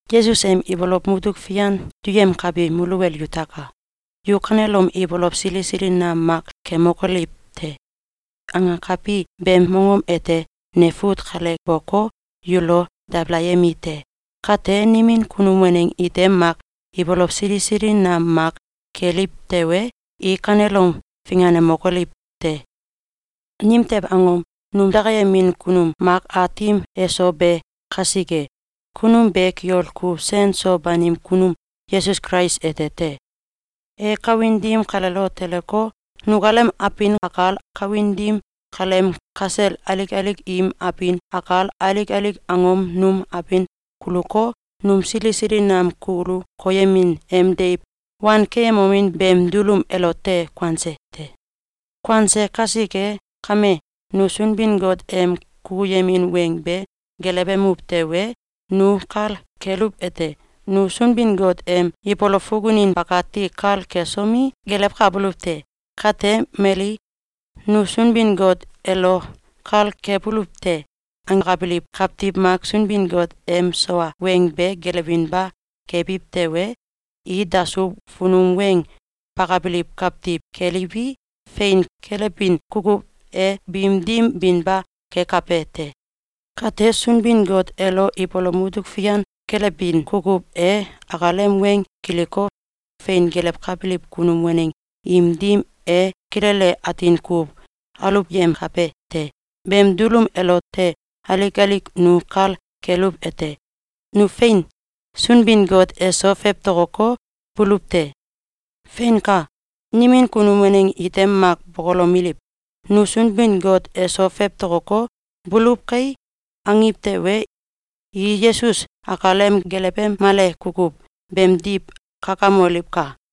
Yesus em ibolow mutuk fian duyemkabi muluwel yutaka! “Yu kanelom ibolow sili sili nam mak kemokoliw te!”, angakabi beem mongom ete ne fut kale boko, yulo dabalayemi te. Kate, nimin kunum waneng ite mak ibolow sili sili nam mak keliw tewe, i kanelom finganemokoliw te! Nimtew angom? Num dakayemin kunum mak Aatim eso be kasike. Kunum be kiol kuw sen so banim kunum Yesus Kulais ete te. E kawin dim kaleelo teleko, nukalem abin akal, kawin dim kaleem kasel alik alik im abin akal, alik alik angom num abin kuluko, num sili sili nam kulu koyemin em deiw wankeyemomin beem dulum elote kuanse te. Kuanse kasike kame, nu Sunbin-Got em kukuyemin weng be gelewemuw tewe, nu kal keluwete: Nu Sunbin-Got em ibolow fukunin bakati kal kesomi, gelewkabuluw te. Kate, mali “Nu Sunbin-Got elo kal kebuluw te!”, angakabiliw kawtiw mak Sunbin-Got em sawa weng be gelewinba kebiw tewe, i dasuw funum weng bakabiliw kawtiw keliwi, fein kelebin kukuw e biim dim binba kekabe te. Kate, Sunbin-Got elo ibolow mutuk fian kelewbin kukuw e akalem weng kiliko, fein gelewkabiliw kunum waneng im dim e kilele atin kuw aluwyemkabe te. Beem dulum elote alik alik nu kal keluwete: Nu fein Sunbin-Got eso fewtokoko, buluw te. Feinka! Nimin kunum waneng ite mak bokolomeliw: “Nu Sunbin-Got eso fewtokoko, buluw kai!”, angiw tewe, i Yesus akalem gelewemale kukuw beemdiw kakamoliwka!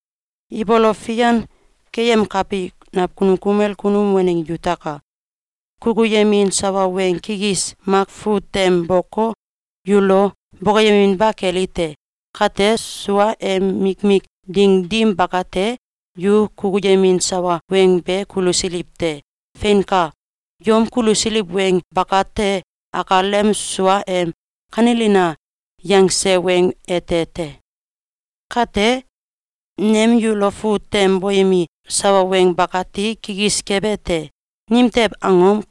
Ibolow fian keyemkabi nakunum kumel kunum waneng yutaka! Kukuyemin sawa weng kikis mak fut tem boko, yulo bokoyeminba keli te. Kate, suaem mikmik ding dim bakate, yu kukuyemin sawa weng be kulusiliw te. Feinka! Yom kulusiliw weng bakate akalem suaem “Kanelina!”, yangse weng ete te. Kate nem yulo fut tem boyemi sawa weng bakati kikis kebe te. Nimtew angom?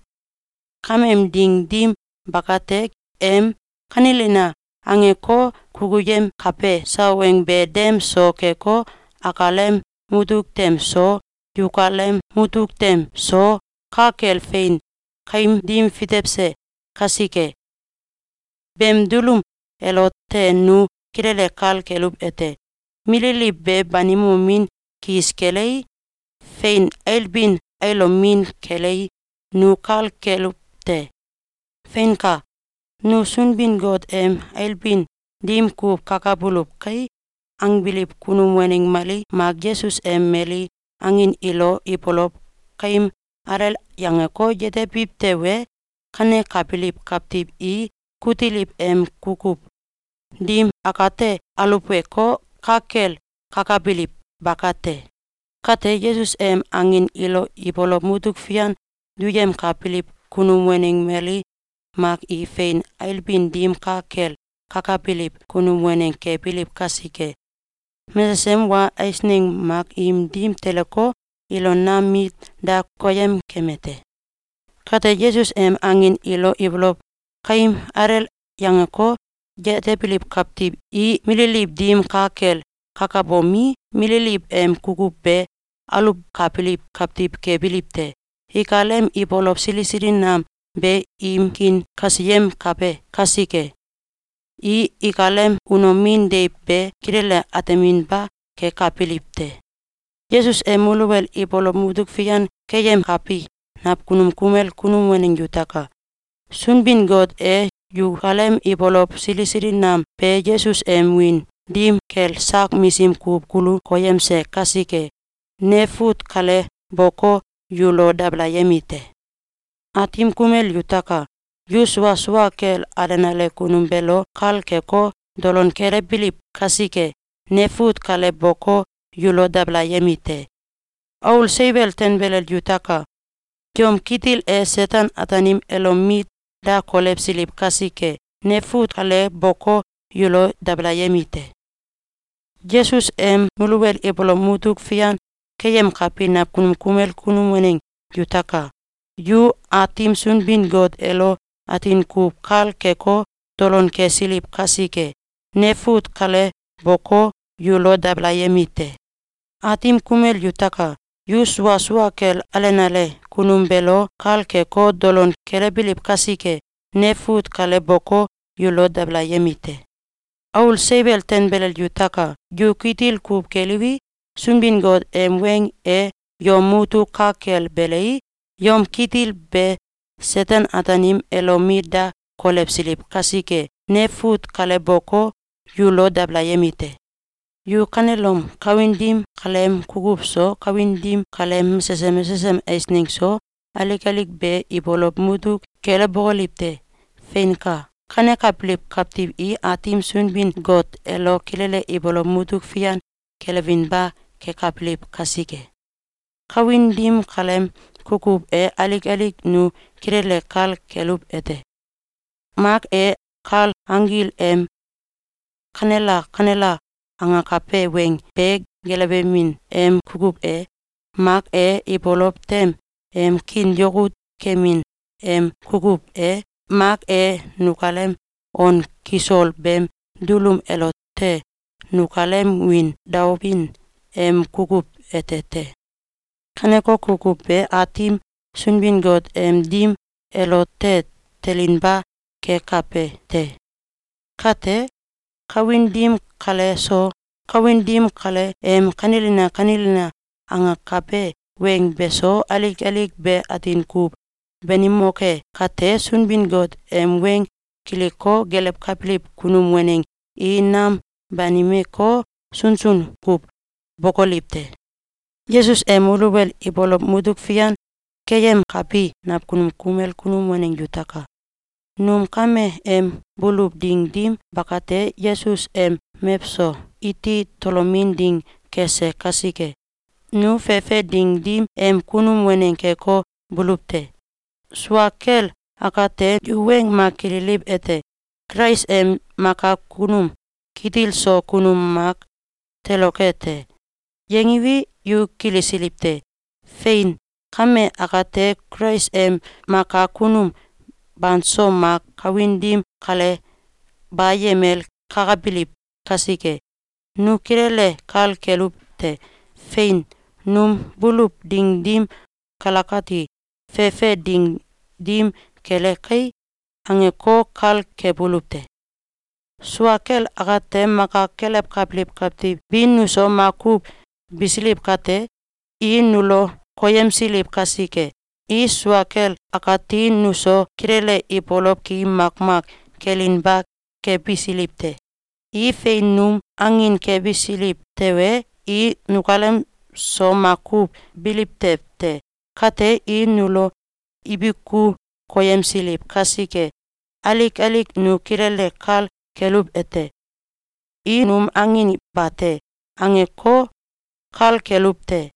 Kameem ding dim bakate, em “Kanelina!”, angeko, kukuyemkabe sawa weng be dem so keko, akalem mutuk tem so, yukalem mutuk tem so, ka kel fein kaim dim fitewse kasike. Beem dulum elote nu kilele kal keluwete: Mililiw be banimomin kis kelei, fein ailbin ailomin kelei, nu kal keluw te. Feinka! “Nu Sunbin-Got em ailbin dim kuw kakabuluw kai!”, angbiliw kunum waneng mali mak Yesus em mali angin ilo ibolow kaim alel yangeko, yetebiw tewe, kanekabiliw kawtiw i kutiliw em kukuw dim akate aluweko, ka kel kakabiliw bakate. Kate, Yesus em angin ilo ibolow mutuk fian duyemkabiliw kunum waneng mali mak i fein ailbin dim ka kel kakabiliw kunum waneng kebiliw kasike, mesesem wa eisneng mak im dim teleko, ilo nam mit da koyem keme te. Kate, Yesus em angin ilo ibolow kaim alel yangeko, yetebiliw kawtiw i mililiw dim ka kel kakabomi, mililiw em kukuw be aluwkabiliw kawtiw kebiliw te. Ikalem ibolow sili sili nam be im kiin kasiyemkabe kasike, i ikalem unomin deiw be kilele ateminba kekabiliw te. Yesus em muluwel ibolow mutuk fian keyemkabi nakunum kumel kunum waneng yutaka! Sunbin-Got e yukalem ibolow sili sili nam be Yesus em wiin dim kel sak misim kuw kulu koyemse kasike, ne fut kale boko, yulo dabalayemi te. Aatim kumel yutaka! Yu sua sua kel alenale kunum beelo kal keko, dolon kelewbiliw kasike, ne fut kale boko, yulo dabalayemi te. Aul seiwel tanbelel yutaka! Yom kitil e Seten-Ataanim elo mit da kolewsiliw kasike, ne fut kale boko, yulo dabalayemi te. Yesus em muluwel ibolow mutuk fian keyemkabi nakunum kumel kunum waneng yutaka! Yu Aatim Sunbin-Got elo atin kuw kal keko, dolon kesiliw kasike, ne fut kale boko, yulo dabalayemi te. Aatim kumel yutaka! Yu sua sua kel alenale kunum beelo kal keko, dolon kelewbiliw kasike, ne fut kale boko, yulo dabalayemi te. Aul seiwel tanbelel yutaka! Yu kitil kuw keliwi, Sunbin-Got em weng e yom mutuk ka kel belei, yom kitil be Seten-Ataanim elo mit da kolewsiliw kasike, ne fut kale boko, yulo dabalayemi te. Yu kanelom kawin dim kaleem kukuw so, kawin dim kaleem mesesem mesesem eisneng so, alik alik be ibolow mutuk kelewbokoliw te! Feinka! Kanekabiliw kawtiw i Aatim Sunbin-Got elo kilele ibolow mutuk fian kelewinba kekabiliw kasike. Kawin dim kaleem kukuw e alik alik nu kilele kal keluwete: Mak e, kal anggil em “Kanela! Kanela!”, angakabe weng be gelewemin em kukuw e, mak e, ibolow tem em kiin yakut kemin em kukuw e, mak e, nukalem on kisol beem dulum elote nukalem wiin daobin em kukuw ete te. Kaneko kukuw be Aatim Sunbin-Got em dim elote telinba kekabe te. Kate, kawin dim kale so, kawin dim kale em “Kanelina! Kanelina!”, angakabe weng beso, alik alik be atin kuw banimoke kate, Sunbin-Got em weng kiliko, gelewkabiliw kunum waneng i nam banimeko, sunsun kuw bokoliw te. Yesus em muluwel ibolow mutuk fian keyemkabi nakunum kumel kunum waneng yutaka! Num kame em buluw ding dim bakate, Yesus em mewso iti tolomin ding kese kasike, nu fefe ding dim em kunum waneng keko, buluw te. Sua kel akate, yu weng mak kililiwete: “Kulais em Maka Kunum Kitil so Kunum mak toloke te!”, yangiwi, yu kilisiliw te. Fein! Kame akate, Kulais em maka kunum banso mak kawin dim kale bayemel kakabiliw kasike, nu kilele kal keluwete: “Fein! Num buluw ding dim kalakati, fefe ding dim kele kai!”, angeko, kal kebuluw te. Sua kel akate, maka kelewkabiliw kawtiw bi nuso makuw bisiliw kate, i nulo koyemsiliw kasike, i sua kel akati nuso kilele ibolow ki makmak kelinba kebisiliw te. I fein num angin kebisiliw tewe, i nukalem so makuw biliw tew te. Kate, i nulo ibiku koyemsiliw kasike, alik alik nu kilele kal keluwete: “I num angin bate!”, angeko, kal keluw te.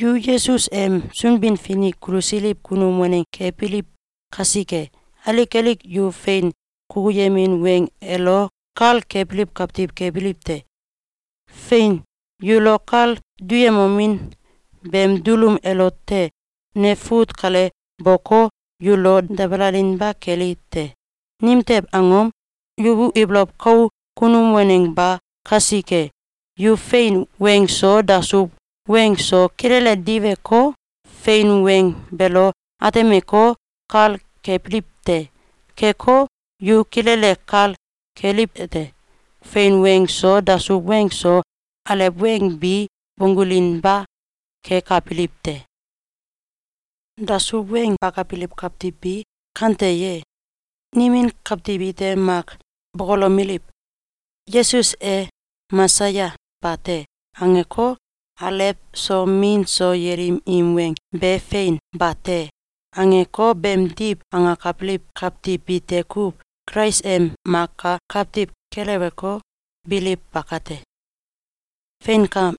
Yu Yesus em Sunbin-Finik kulusiliw kunum waneng kebiliw kasike, alik alik yu fein kukuyemin weng elo kal kebiliw kawtiw kebiliw te. Fein! Yulo kal duyemomin beem dulum elote ne fut kale boko, yulo dabalalinba keli te. Nimtew angom? Yu ibolow kau kunum waneng ba kasike. Yu fein weng so, dasuw weng so, kilele diweko, fein weng beelo atemeko, kal kebiliw te. Keko, yu kilele kal keliwete: Fein weng so, dasuw weng so, alew weng bi bonggulinba kekabiliw te. Dasuw weng bakabiliw kawtiw bi kante ye? Nimin kawtiw ite mak bokolomeliw: “Yesus e Mesaya bate!”, angeko, “Alew so, Min so, yelim im weng be fein bate!”, angeko, beemdiw angakabiliw kawtiw bite kuw Kulais em Maka Kawtiw keleweko, biliw bakate. Feinka!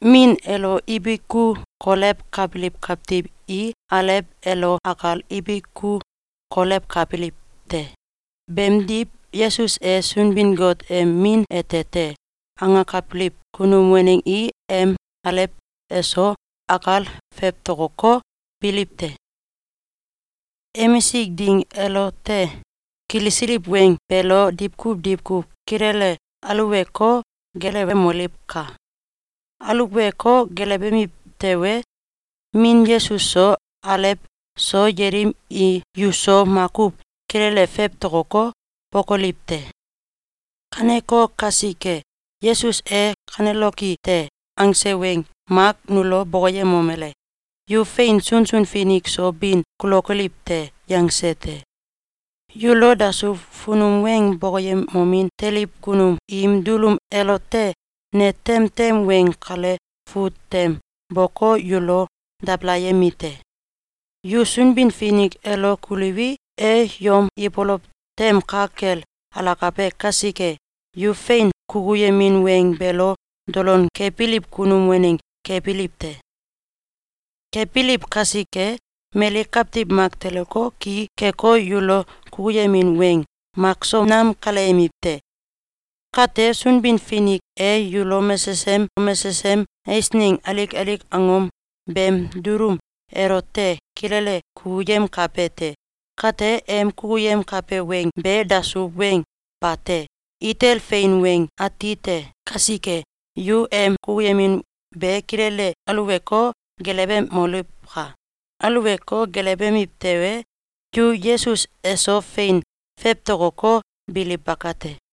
Min elo ibiku kolewkabiliw kawtiw i Alew elo akal ibiku kolewkabiliw te. Beemdiw, “Yesus e Sunbin-Got em Min ete te!”, angakabiliw kunum waneng i em Alew eso akal fewtokoko, biliw te. Emisik ding elote kilisiliw weng beelo diwkuw diwkuw kilele aluweko, gelewemoliwka! Aluweko, gelewemiw tewe, Min Yesus so, Alew so, yelim i yuso makuw kilele fewtokoko, bokoliw te. Kaneko kasike, Yesus e “Kaneloki te!”, angse weng mak nulo bokoyemomele: “Yu fein sunsun finik so bin kulokoliw te!”, yangse te. Yulo dasuw funum weng bokoyemomin teliw kunum im dulum elote ne temtem weng kale fut tem boko, yulo dabalayemi te. Yu Sunbin-Finik elo kuliwi, e yom ibolow tem ka kel alakabe kasike, yu fein kukuyemin weng beelo dolon kebiliw kunum waneng kebiliw te. Kebiliw kasike, mali kawtiw mak teleko, ki keko, yulo kukuyemin weng makso nam kaleyemiw te. Kate, Sunbin-Finik e yulo mesesem mesesem eisneng alik alik angom beem dulum elote kilele kukuyemkabe te. Kate, em kukuyemkabe weng be dasuw weng bate! Itel fein weng atite kasike, yu em kukuyemin be kilele aluweko, gelewemoliwka! Aluweko, gelewemiw tewe, yu Yesus eso fein fewtokoko, biliw bakate.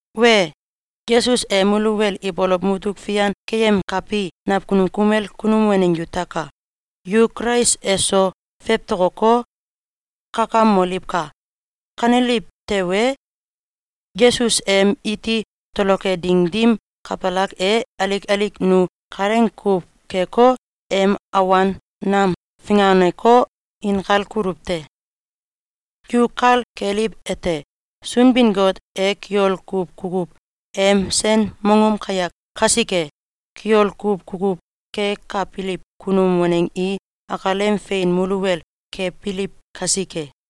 Wee! Yesus em muluwel ibolow mutuk fian keyemkabi nakunum kumel kunum waneng yutaka! Yu Kulais eso fewtokoko, kakamoliwka! Kaneliw tewe, Yesus em iti toloke ding dim kabalak e, alik alik nu kalaing kuw keko, em awan nam finganeko, inkal kuluw te. Yu kal keliwete: Sunbin-Got e kiol kuw kukuw em sen mongom kayak kasike, kiol kuw kukuw kekabiliw kunum waneng i akalem fein muluwel kebiliw kasike.